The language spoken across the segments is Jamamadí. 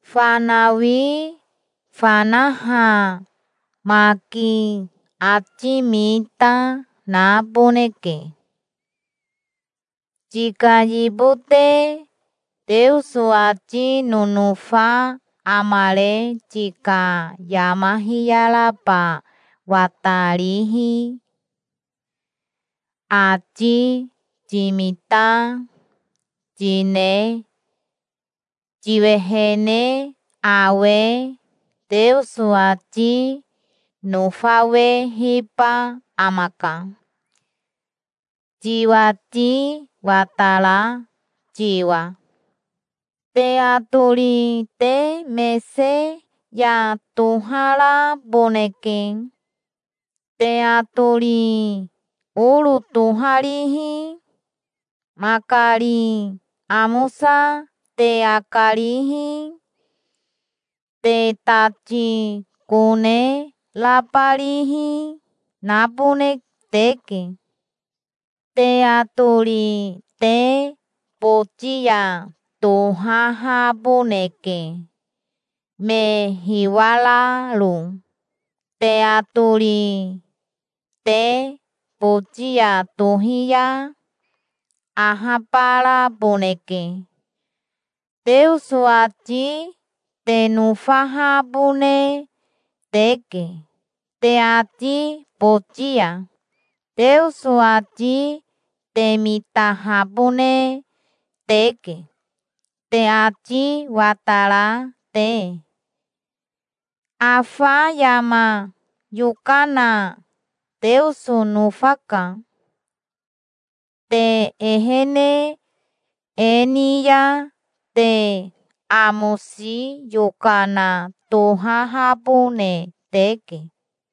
Fanawi fanaha maki ati mita naboneke. Tika yibote Teoso ati nonofa amare tika yama hiyaraba watarihi, ati timita, tine tiwehene awe Teoso ati nofawehiba amaka, tiwati watara tiwa. Te atori te mese ya toharaboneke. Te atori oro toharihi, makari amosa te akarihi, te tati kone rabarihi, nabone teke. Te atori te boti ya tohahaboneke, me hiwararo. Te atori te boti ya tohi ya ahabaraboneke. Teoso ati te nofahabone teke te ati boti ya. Teoso ati te mitahabone teke, te ati watara te. Afa yama yokana Teoso nofaka. Te ehene e ni ya te amosi yokana tohahabone teke.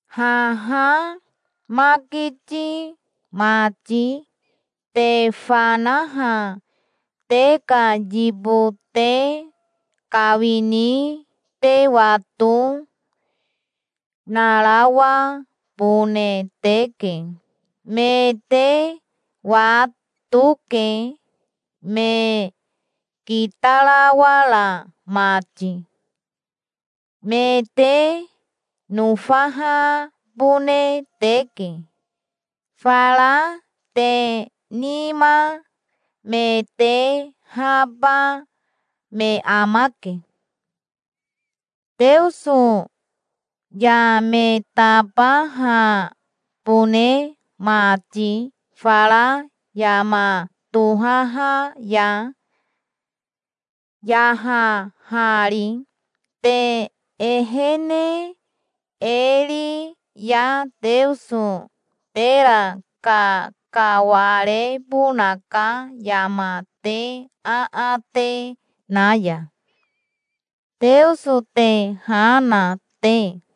Haha makiti mati te fanaha te ka yibote kawini te wato, narawabone teke. Me te watoke, me kitarawara mati. Me te nofahabone teke. Fara te nima me tehaba me amake, Teoso ya me tabahabone mati fara yama tohaha ya, yahahari. Te ehene e ri ya Teoso tera kakawarebonaka yama te aate na ya, Teoso te ha na te.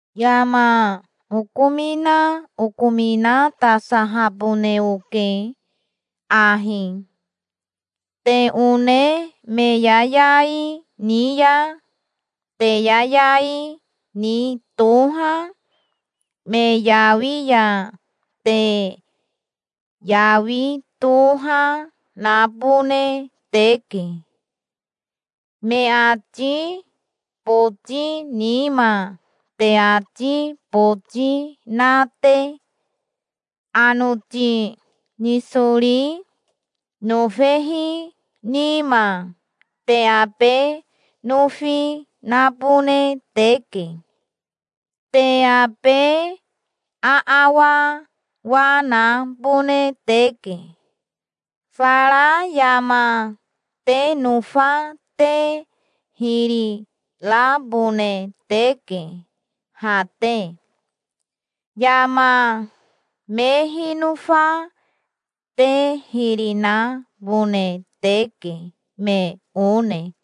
Yama okomina okominatasahabone oke ahi. Te one me yayai ni ya te yayai ni toha, me yawi ya te yawi toha nabone teke, me ati boti nima te ati boti na te. Anoti nisori nofehi nima te abe nofi nabone teke. Te abe aawawa nabone teke. Fara yama te nofa te hiri rabone teke ha te. Yama me hinofa te hiri nabone teke, me one.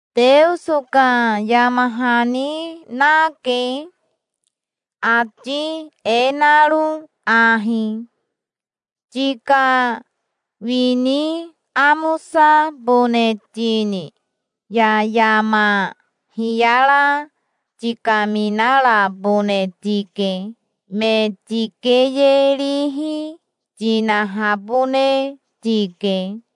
Teoso ka yama hani nake, ati e naro ahi: "Tika wini amosabone tini ya yama hiyara tikaminarabone tike. Me tikeyerihi tinahabone tike.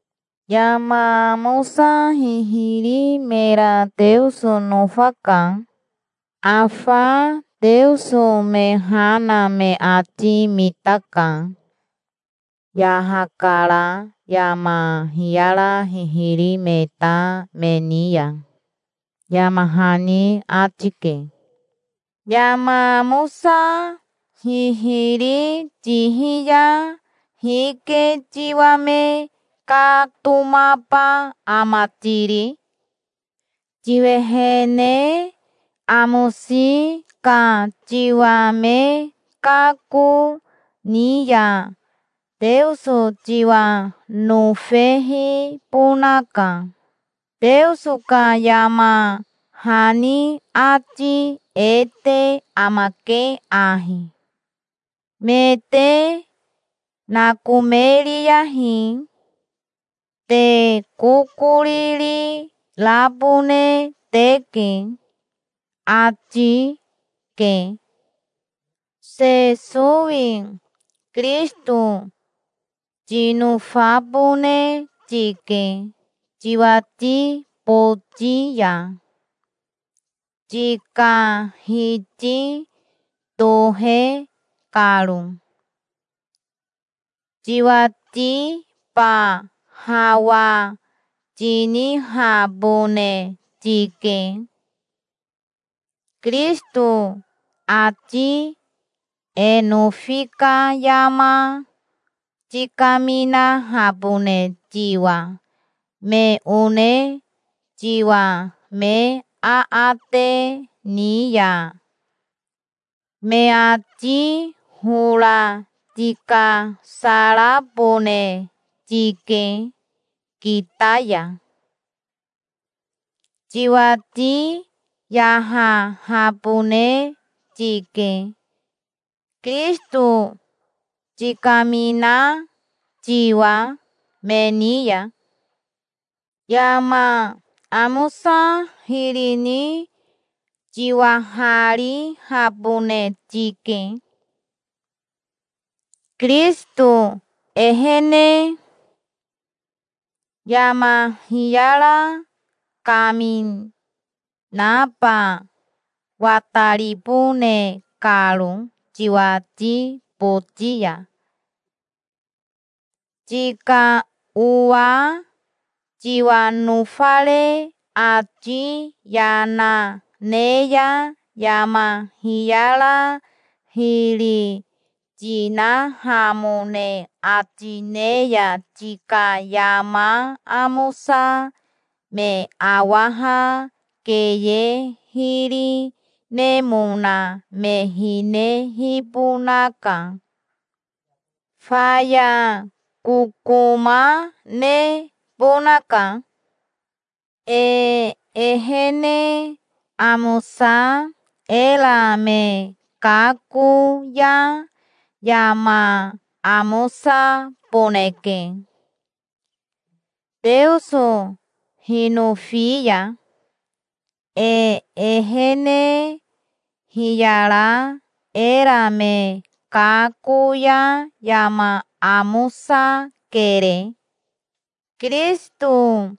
Yama amosa hihiri mera Teoso nofaka. Afa Teoso me ha na me ati mitaka. Yahakara yama hiyara hihiri me ta me ni ya", yama hani ati ke. Yama amosa hihiri tihi ya hike tiwa me katomaba ama tiri? Tiwehene amosi ka tiwa me kako ni ya Teoso tiwa nofehibonaka. Teoso ka yama hani ati e te amake ahi: "Me te nakomeriyahi. Te kokoriri rabone teke", ati ke. Sesowi Kirisito tinofabone tike tiwati boti ya, tika Hiti tohe karo. Tiwatiba hawa tinihabone tike, Kirisito ati e nofi ka yama tikaminahabone tiwa me one tiwa me aate ni ya. Me ati hora tikasarabone tike kita ya. Tiwati yahahabone tike, Kirisito tikamina tiwa me ni ya. Yama amosa hiri ni tiwaharihabone tike, Kirisito ehene, yama hiyara kaminaba wataribone karo tiwati boti ya. Tika owa tiwa nofare ati yana ne ya yama hiyara hiri tinahamone ati ne ya tika yama amosa me awaha keye hiri nemona me hinehibonaka. Faya kokoma nebonaka. E ehene amosa era me kako ya yama amosaboneke, Teoso hinofi ya. E ehene hiyara era me kako ya yama amosakere. Kirisito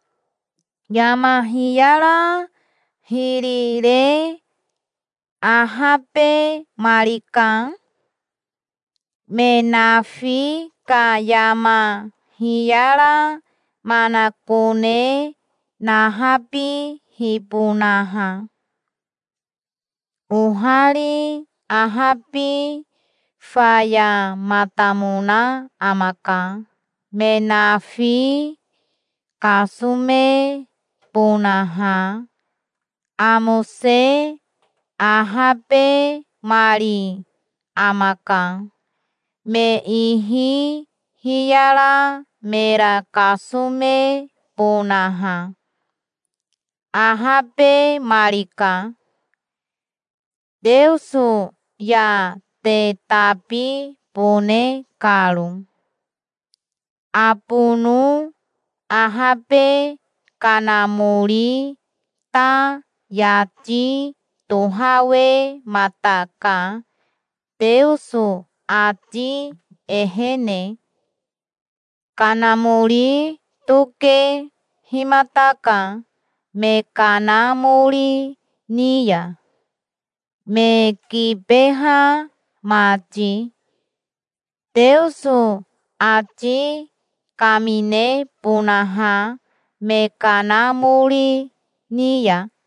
yama hiyara hiri re ahabemarika, me nafi ka yama hiyara manakone nahabihibonaha. Ohari ahabi fayamatamona amaka, me nafi kasomebonaha. Amose ahabemari amaka, me ihi hiyara mera kasomebonaha. Ahabemarika, Teoso ya te tabibone karo. Abono ahabe Kanamori ta yati tohawemataka Teoso ati ehene. Kanamori tokehimataka me kanamori ni ya, me kibeha mati, Teoso ati kaminebonaha me kanamori ni ya.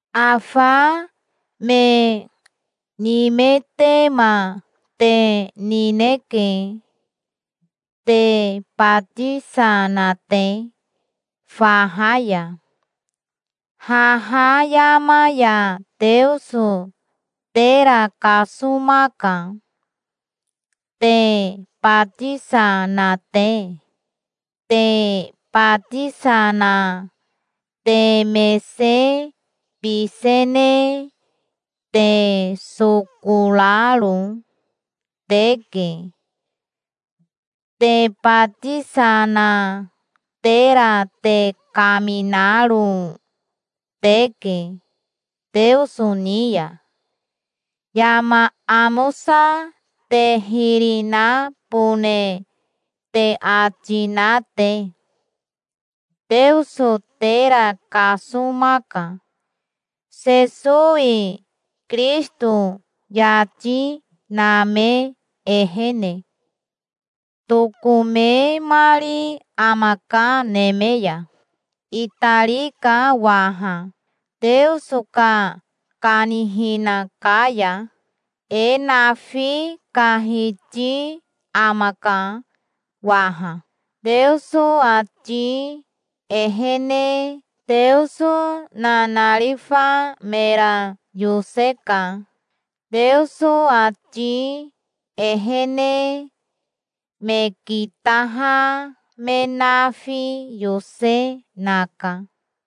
Afa me nimetema te nineke, te batisa na te faha ya. Haha yama ya Teoso tera kasomaka, te batisa na te. Te batisa na te mese bisene te soko raro teke. Te batisa na tera te kaminaro teke Teoso ni ya, yama amosa te hiri nabone te ati na te. Teoso tera kasomaka, Sesowi Kirisito yati name ehene. Tokomemari amaka neme ya. Itarika waha, Teoso ka kanihina ka ya. E nafi ka Hiti amaka waha, Teoso ati ehene. Teoso nanarifa mera yoseka, Teoso ati ehene. Me kitaha me nafi yose, naka.